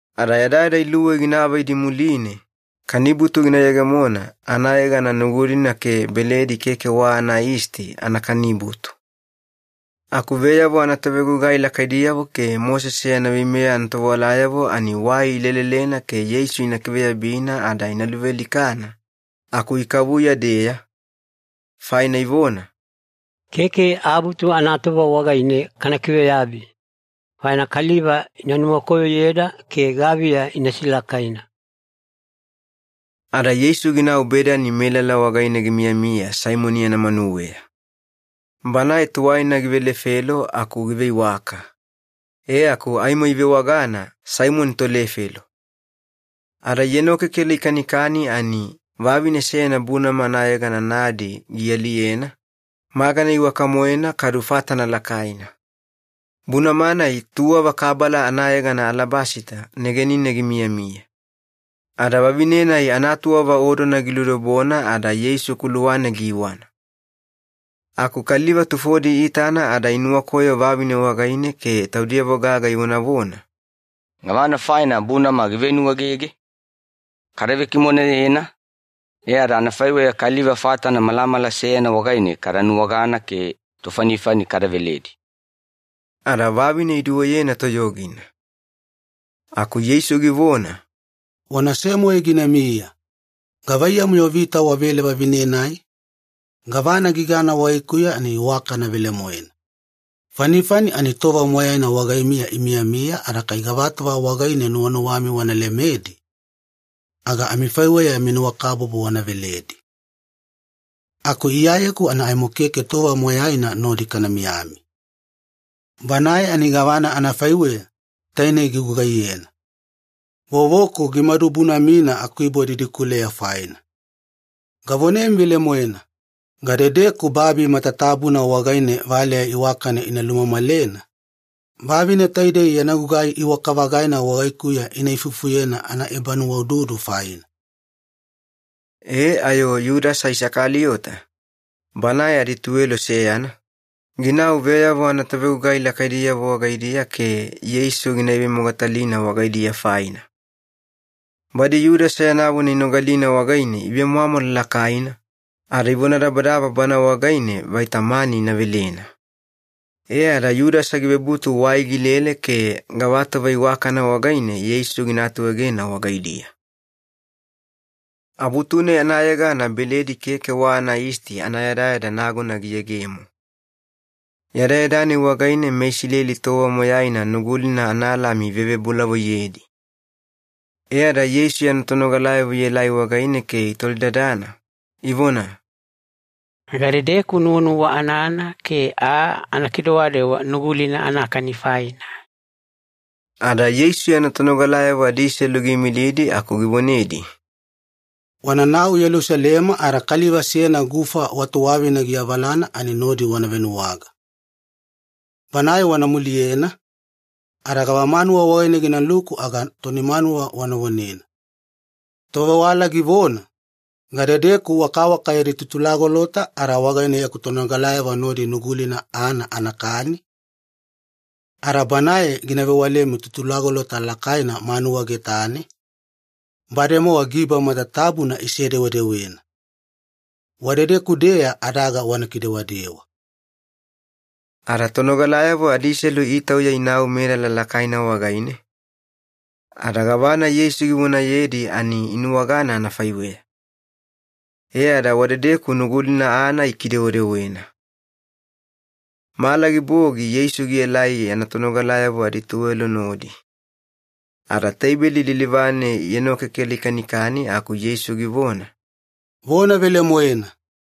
Ada yadayada iluwei gina avaidi muline, kanibutu gina yegemona anayegana Nugulina ke Beledi Keke wa Anayisti Anakanibutu. Aku veyavo anatovegugai lakaidiyavo ke Mosese yana veimeya anatovewalayavo ani wai ilelelena ke Yeisu ina kiveyabina ada ina luvealikana, aku ikavuya-deya, faina ivona, “Keke Abutu anatova wagaine kana kiveyabi, faina kaliva ina nuwakoyoyeda ke gaviya ina silakaina.” Ada Yeisu ginau Bedani melala wagaine gimiyamiya Saimoni yana manuweya. Banae tuwaina givelefelo aku giveiwaka, e aku aimo ivewagana Saimoni tolefelo. Ada ienokekela ikanikani ani vavine seyana bunama anayegana ‘nadi’ gialiyena, magana iwaka-moena kadu fatana lakaina. Bunama-nai tuwava kabala anayegana alabasita negenine gimiyamiya. Ada vavine-nai anatuwava odona giludobona ada Yeisu kuluwane giiwana. Aku kaliva tufodi iitana ada inuwakoyo vavine wagaine ke taudiyavo gaga ivonavona, “Gavana faina bunama givenuwaegege? Kada vekimoneyena, e ada anafaiweya kaliva fatana malamala seyana wagaine kada nuwagana ke tofanifani kada veledi.” Ada vavine iduweyena toyogina. Aku Yeisu givona, “Wanase-moe ginamiya. Gavaiyamu-yo vita wavele vavine-nai? Gavana gigana wagaikuya ani iwakana velemoena. Fanifani ani tova moyaina wagaimiya imiyamiya ada kai gavatova wagaine nuwanuwami wana lemedi, aga amifaiweya yami nuwakabubu wana veledi. Aku Iyayeku ani aimo keke tova moyaina nodi kana miyami. Banae ani gavana anafaiweya, taine gigugaiyena. Vovoku gimadu bunamina akuibo didikuleya faina. Gavonemi velemoena, gadedeku babi matatabuna wagaine valeya iwakana ina lumamalena, vavine taidei yana gugai iwaka-vagaina wagaikuya ina ifufuyena anaebanuwaududu faina.” E ayo Yudasa Isakaliyota, banae adituwelo seyana, ginau veyavo anatovegugai lakaidiyavo wagaidiya ke Yeisu gina ivemogatalina wagaidiya faina. Badi Yudasa yana vona inogalina wagaine ivemwamwala lakaina, ada ivonadabadaba bana wagaine vaita mani ina velena. E ada Yudasa givebutu wai gilele ke gavatova iwakana wagaine Yeisu gina atuegena wagaidiya. Abutu-nai anayegana Beledi Keke wa Anayisti anayadayada nagona giyegemo. Yadayada-nai wagaine meIsileli tova moyaina Nugulina analami ivevebolavoiyedi. E ada Yeisu yana tonogalayavo ielai wagaine ke itolidadana, ivona, “Gadedeku nuwanuwa anana ke aa ana kidewadewa Nugulina anakani faina?” Ada Yeisu yana tonogalayavo adiselu giimilidi aku givonedi, “Wananau Yelusalema ada kaliva seyana gufa wa tuwavina giavalana, ani nodi wana venuwaga. Banae wana muliyena, ada gavamanuwa wagaine ginaluku aga toni manuwa wana vonena, ‘Tovewala givona, Gadedeku wakawaka yadi tutulagolota ada wagaine yaku tonogalayavo nodi Nugulina aana anakani?’ Ada banae gina vewalemi tutulagolota lakaina manuwa getane, bademowa giba matatabuna isedewedewena. Wadedeku-deya adaga wana kidewadewa.” Ada tonogalayavo adiselu itauya inau melala lakaina wagaine, ada gavana Yeisu givonayedi ani inuwagana anafaiweya. E ada wadedeku Nugulina aana ikidewedewena. Mala gibogi Yeisu gielai yana tonogalayavo adituwelo nodi. Ada teibeli lilivane ienokekela ikanikani aku Yeisu givona, “Vona velemoena,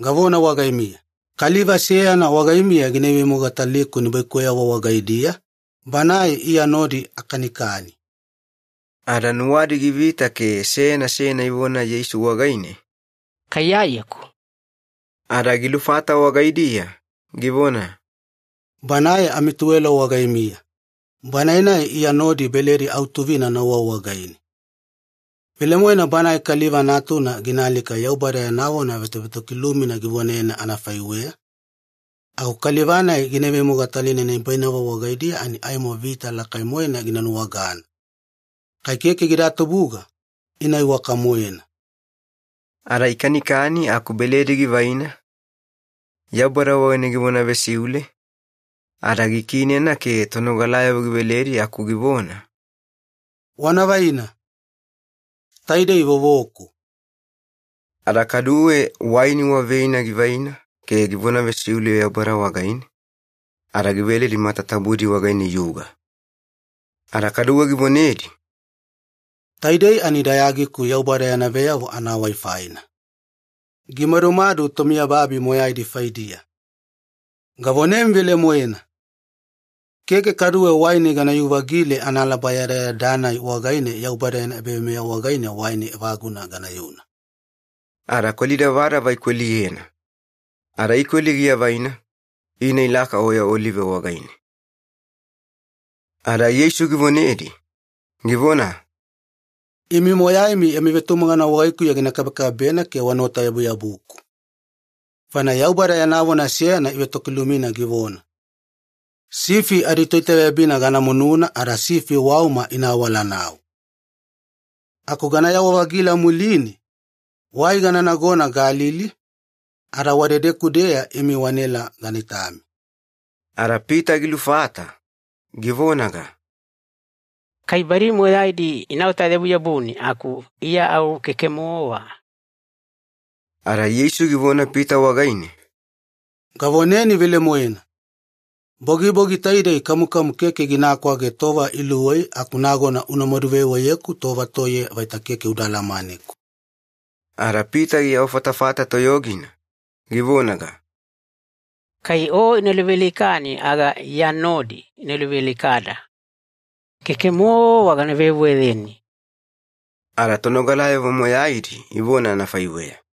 gavona wagaimiya, kaliva seyana wagaimiya gina ivemogataliku nibaikuweyavo wagaidiya, banae Iya nodi akanikani.” Ada nuwadi givita ke seyana seyana ivona Yeisu wagaine, “Kai Iyayeku?” Ada gilufata wagaidiya, givona, “Banae amituwelo wagaimiya, banae-nai Iya nodi beledi autuvina nauwa wagaine. Velemoena Banae Kaliva Natuna gina alika Yaubada yana vona vetovetokilumina givonayena anafaiweya, aku kaliva-nai gina ivemogatalina nibainavo wagaidiya ani aimo vita lakai-moena gina nuwagana! Kai keke gida tubuga, ina iwaka-moena.” Ada ikanikani aku beledi givaina, Yaubada wagaine givona vesiule, ada gikiinena ke tonogalayavo giveledi aku givona, “Wana vaina. Taidei vovoku.” Ada kaduwe waini wa veina givaina ke givona vesiule Yaubada wagaine, ada giveledi matatabudi wagaine iyuga. Ada kaduwe givonedi, “Taidei ani dayagiku Yaubada yana veyavo anawai faina. Gimadumadu tomiyababi moyaidi faidiya. Gavonemi velemoena, keke kaduwe waini ganayu-vagile analaba yadayada-nai wagaine Yaubada yana ebaveimeya wagaine waini evaguna ganayuna.” Ada kweli davadava ikweliyena. Ada ikweli giavaina, ina ilaka Oya Olive wagaine. Ada Yeisu givonedi, givona, “Imi moyaimi yami vetumagana wagaikuya gina kabekabebena ke wanaota-yabuyabuku. Faina Yaubada yana vona seyana ivetokilumina givona, ‘Sifi aditoitaveyabina gana mununa ada sifi wauma ina awalanau.’ Aku ganayawa-vagila muline, wai gana nagona Galili, ada wadedeku-deya imi wanaela gana itami.” Ada Pita gilufata, givonaga, “Kai badi moyaidi inaota-yabuyabuni aku Iya au keke-mowa!” Ada Yeisu givona Pita wagaine, “Gavoneni velemoena, bogibogi taidei kamukamu keke gina kwage tova iluwei aku nagona unamadu veweyeku tova toiye vaita keke uda alamaneku.” Ada Pita giawafatafata toyogina, givonaga, “Kai O ina luvealikani aga Iya nodi ina luvealikada. Keke-mowa gana veweyeni!” Ada tonogalayavo moyaidi ivona anafaiweya.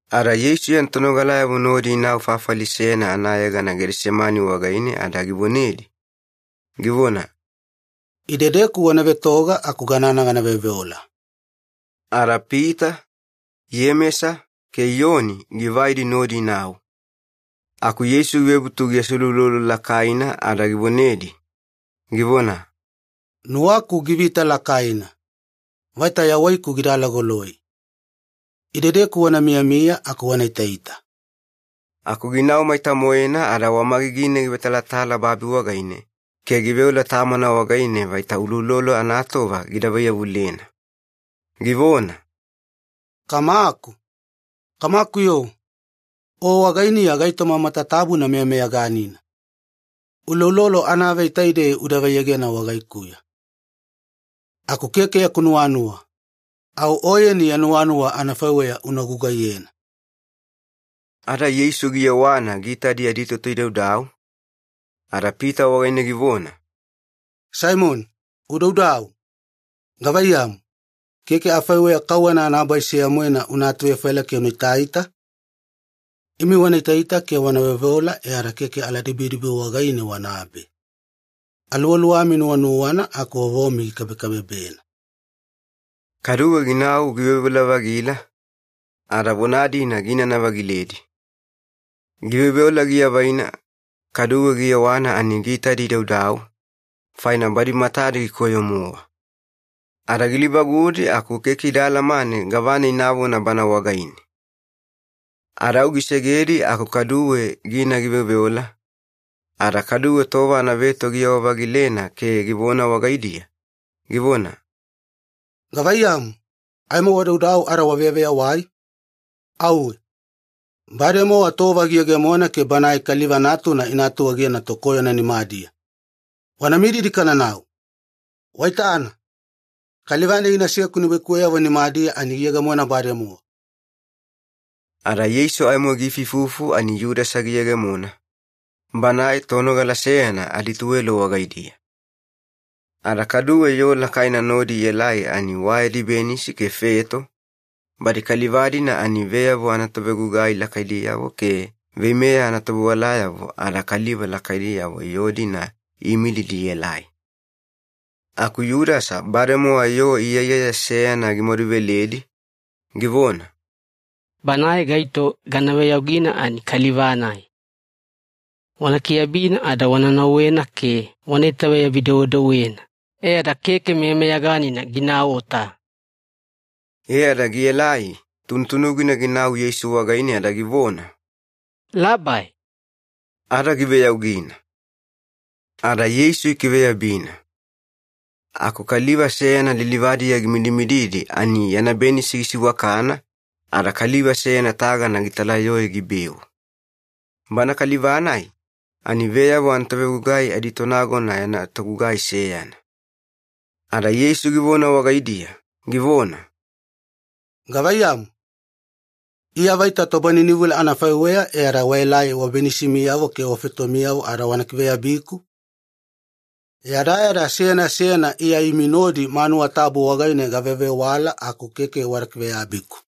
Ada Yeisu yana tonogalayavo nodi inau fafali seyana anayegana Gedesemani wagaine ada givonedi, givona, “Idedeku wana vetoga aku ganana gana veoveola.” Ada Pita, Iyemesa, ke Iyoni givaidi nodi inau. Aku Yeisu givebutu giaseuloulolo lakaina ada givonedi, givona, “Nuwaku givita lakaina, vaita yawaiku gida alagoloi. Idedeku wana miyamiya aku wana itaita.” Aku ginau maita-moena ada wamagigine givetalatala babi wagaine ke giveola Tamana wagaine vaita uloulolo anatova gida vaiyavulena. Givona, “Kamaku, Kamaku-yo, O wagainiya gaitoma matatabuna meyameyaganina. Uloulolo anavei taidei uda vaiyegena wagaikuya. Aku keke yaku nuwanuwa, au Oyeni ya nuwanuwa anafaiweya una gugaiyena.” Ada Yeisu giyewana giitadi aditoto idaudau, ada Pita wagaine givona, “Saimoni, udaudau. Gavaiyamu, keke afaiweya kauwana anabai seya-moena una atuvefaila ke una itaita? Imi wana itaita ke wana veoveola e ada keke aladibidibi wagaine wanabe. Aluwaluwami nuwanuwana aku vovomi gikabekabebena.” Kaduwe ginau giveoveola-vagila, ada vona-dina giinana-vagiledi. Giveoveola giavaina, kaduwe giyewana ani giitadi idaudau, faina badi matadi gikoyo-mowa. Ada gilivagudi aku keke ida alamane gavana inavona Bana wagaine. Ada au gisegedi aku kaduwe gina giveoveola, ada kaduwe tova anaveto giyewa-vagilena ke givona wagaidiya, givona, “Gavaiyamu, aimo wadaudau ada waveyaveyawai? Auwe! Bademowa tova giyegemona ke Banae Kaliva Natuna ina atuegena tokoyona nimadiya. Wana mididi kananau. Waitana, kaliva-nai ginaseku nibaikuweyavo nimadiya ani giyegemona bademowa!” Ada Yeisu aimo giifuifufu ani Yudasa giyegemona, banae tonogala seyana adituwelo wagaidiya. Ada kaduwe yoo lakaina nodi ielai ani wa yadi benisi ke feto, badi kaliva-dina ani veyavo anatovegugai lakaidiyavo ke veimeya anatovewalayavo ada kaliva lakaidiyavo yoo-dina iimilidi ielai. Aku Yudasa bademowa yoo iyaiyaya seyana gimaduveledi, givona, “Banae gaito gana veyaugina ani kaliva-nai. Wana kiveyabina ada wana nauwena ke wana itaveyabi-dewedewena e ada keke meyameyaganina ginaota.” E ada gielai tunutunugina ginau Yeisu wagaine ada givona, “Labai!” Ada giveyaugina. Ada Yeisu ikiveyabina. Aku kaliva seyana lilivadiya gimidimididi ani yana benisi gisiwakana ada kaliva seyana tagana gitalayoe gibeu. Bana kaliva-nai ani veyavo anatovegugai aditonagona yana togugai seyana. Ada Yeisu givona wagaidiya, givona, “Gavaiyamu, Iya vaita tobaninivula anafaiweya e ada waelai wabenisimiyavo ke wafetomiyavo ada wana kiveyabiku? Yadayada seyana seyana Iya imi nodi manuwa tabu wagaine gavevewala aku keke wada kiveyabiku.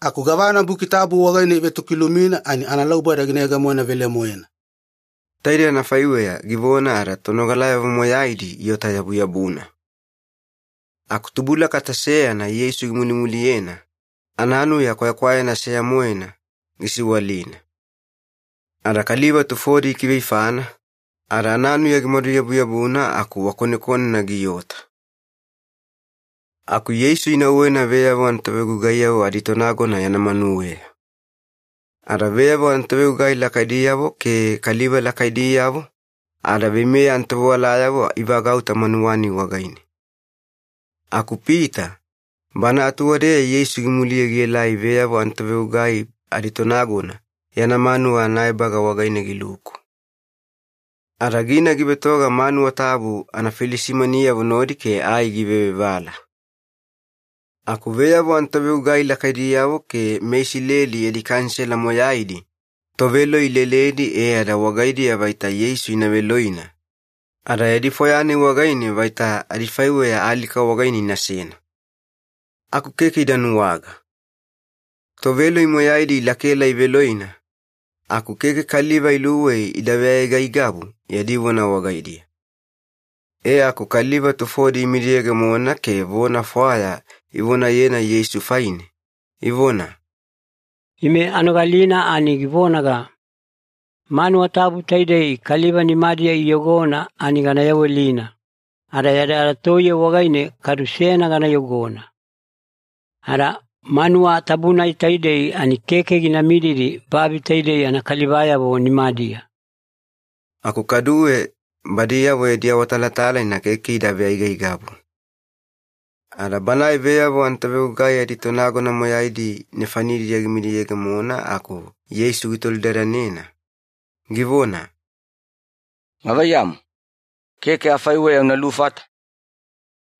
Aku gavana Buki Tabu wagaine ivetokilumina ani analauboda gina yegemona velemoena.” Taidei anafaiweya givona ada tonogalayavo moyaidi iota-yabuyabuna. Aku tubulakata seyana Yeisu gimulimuliyena, ananuya kwayakwayana seya-moena gisiwalina. Ada kaliva tufodi ikiveifana, ada ananuya gimaduyabuyabuna aku wakonekonena giota. Aku Yeisu inauwena veyavo anatovegugaiyavo aditonagona yana manuweya. Ada veyavo anatovegugai lakaidiyavo ke kaliva lakaidiyavo ada veimeya anatovewalayavo ivagauta manuwa-nai wagaine. Aku Pita bana atuwadeya Yeisu gimuliye gielai veyavo anatovegugai aditonagona yana manuwa anaebaga wagaine giluku. Ada gina givetoga manuwa tabu anafilisimaniyavo nodi ke ai givevevala. Aku veyavo anatovegugai lakaidiyavo ke meIsileli yadi Kanisela moyaidi toveloi ileledi e ada wagaidiya vaita Yeisu ina veloina, ada yadi fwaya-nai wagaine vaita adifaiweya alika wagaine inasena. Aku keke ida nuwaga. Toveloi moyaidi ilakaela iveloina, aku keke kaliva iluwei ida veaigaigabu yadi vona wagaidiya. E aku kaliva tufodi imidiyegemona ke vona fwaya ivonayena Yeisu faine, ivona, “Ime anogalina ani givonaga, ‘Manuwa tabu taidei kaliva nimadiya iyogona ani gana yawelina, ada yadayada toiye wagaine kadu seyana gana yogona. Ada manuwa tabu-nai taidei ani keke gina mididi babi taidei anakalivayavo nimadiya.’” Aku kaduwe badiyavo yadi awatalatalaina keke ida veaigaigabu. Ada banae veyavo anatovegugai aditonagona moyaidi nefanidiya gimidiyegemona aku Yeisu gitolidadanena, givona, “Gavaiyamu, keke afaiweya una lufata?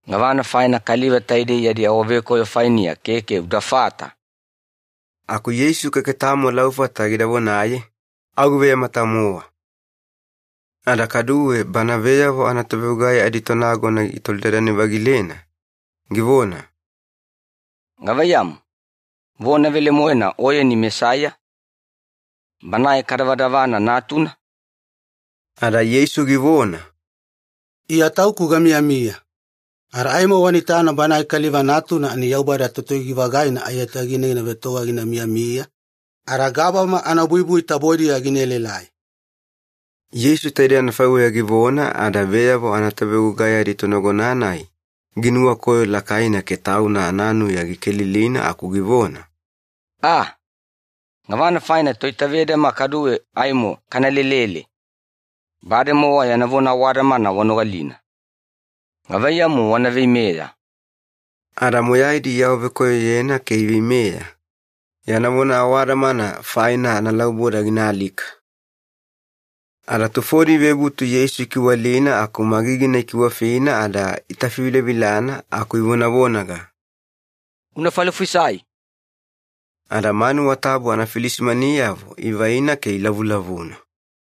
Gavana faina kaliva taidei yadi awavekoyo fainiya keke udafata?” Aku Yeisu keke tamo laufata gida vonaye, au giveyamata-mowa. Ada kaduwe bana veyavo anatovegugai aditonagona gitolidadane-vagilena, givona, “Gavaiyamu, vona velemoena Oyeni Mesaiya, Banae kadavadavana Natuna?” Ada Yeisu givona, “IYA TAUKU GAMIYAMIYA. Ada aimo wana itana Banae Kaliva Natuna ani Yaubada Totoyogi-vagaina aiyatagine gina vetoga gina miyamiya, ada gabama anabuibui tabodiya gina elaelai.” Yeisu taidei anafaiweya givona ada veyavo anatovegugai aditonagona-nai ginuwakoyo lakaina ke tauna ananuya gikelilina aku givona, “Aaa! Gavana faina toitavedama kaduwe aimo kana lelele? Bademowa yana vona awadamana wanogalina. Gavaiyamu wana veimeya?” Ada moyaidi iawavekoyoyena ke iveimeya, yana vona awadamana faina analauboda gina alika. Ada tufodi ivebutu Yeisu ikiwalina aku magigina ikiwafina ada itafivilavilana aku ivonavonaga, “Una falofisai!” Ada manuwa tabu anafilisimaniyavo ivaina ke ilavulavuna.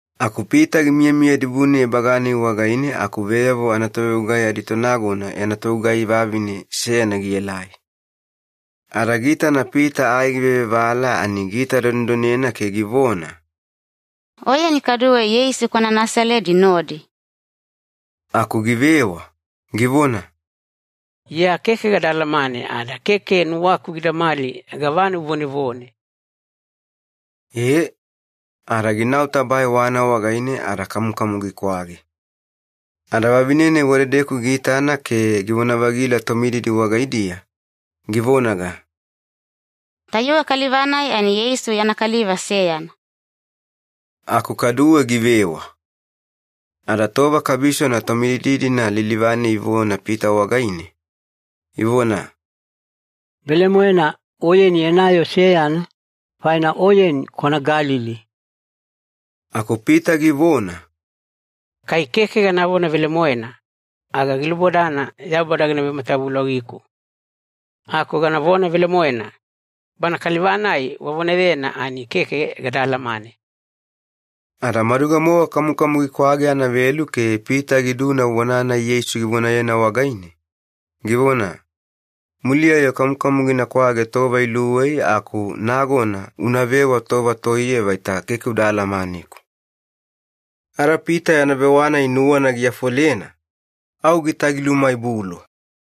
Aku Pita gimiyamiya dibune ebaga-nai wagaine aku veyavo anatovegugai aditonagona yana togugai vavine seyana gielai. Ada giitana Pita ai givevevala ani giitadonedonena ke givona, “Oyeni kaduwe Yeisu kwana Nasaledi nodi.” Aku givewa, givona, “Iya keke gada alamane ada keke nuwaku gidamali gavana uvonevone!” E, ada ginau tabae wana wagaine ada kamukamu gikwage. Ada vavine-nai wadedeku giitana ke givona-vagila tomididi wagaidiya, givonaga, “Tayuwe kaliva-nai ani Yeisu yana kaliva seyana.” Aku kaduwe givewa. Ada tova kabisona tomididi-dina lilivane ivona Pita wagaine, ivona, “Velemoena, oyeni yana yoo seyana, faina oyeni kwana Galili.” Aku Pita givona, “Kai keke ganavona velemoena, aga gilubodana Yaubada gina vematavulogiku. Aku ganavona velemoena, Bana Kaliva-nai wavonayena ani keke gada alamane!” Ada maduga-mowa kamukamu gikwage anavelu ke Pita giduna vona-nai Yeisu givonayena wagaine, givona, “Muliya-yo kamukamu gina kwage tova iluwei aku nagona unavewa tova toiye vaita keke uda alamaneku.” Ada Pita yana vewa-nai nuwana giafolena, au gitagilumaibulu.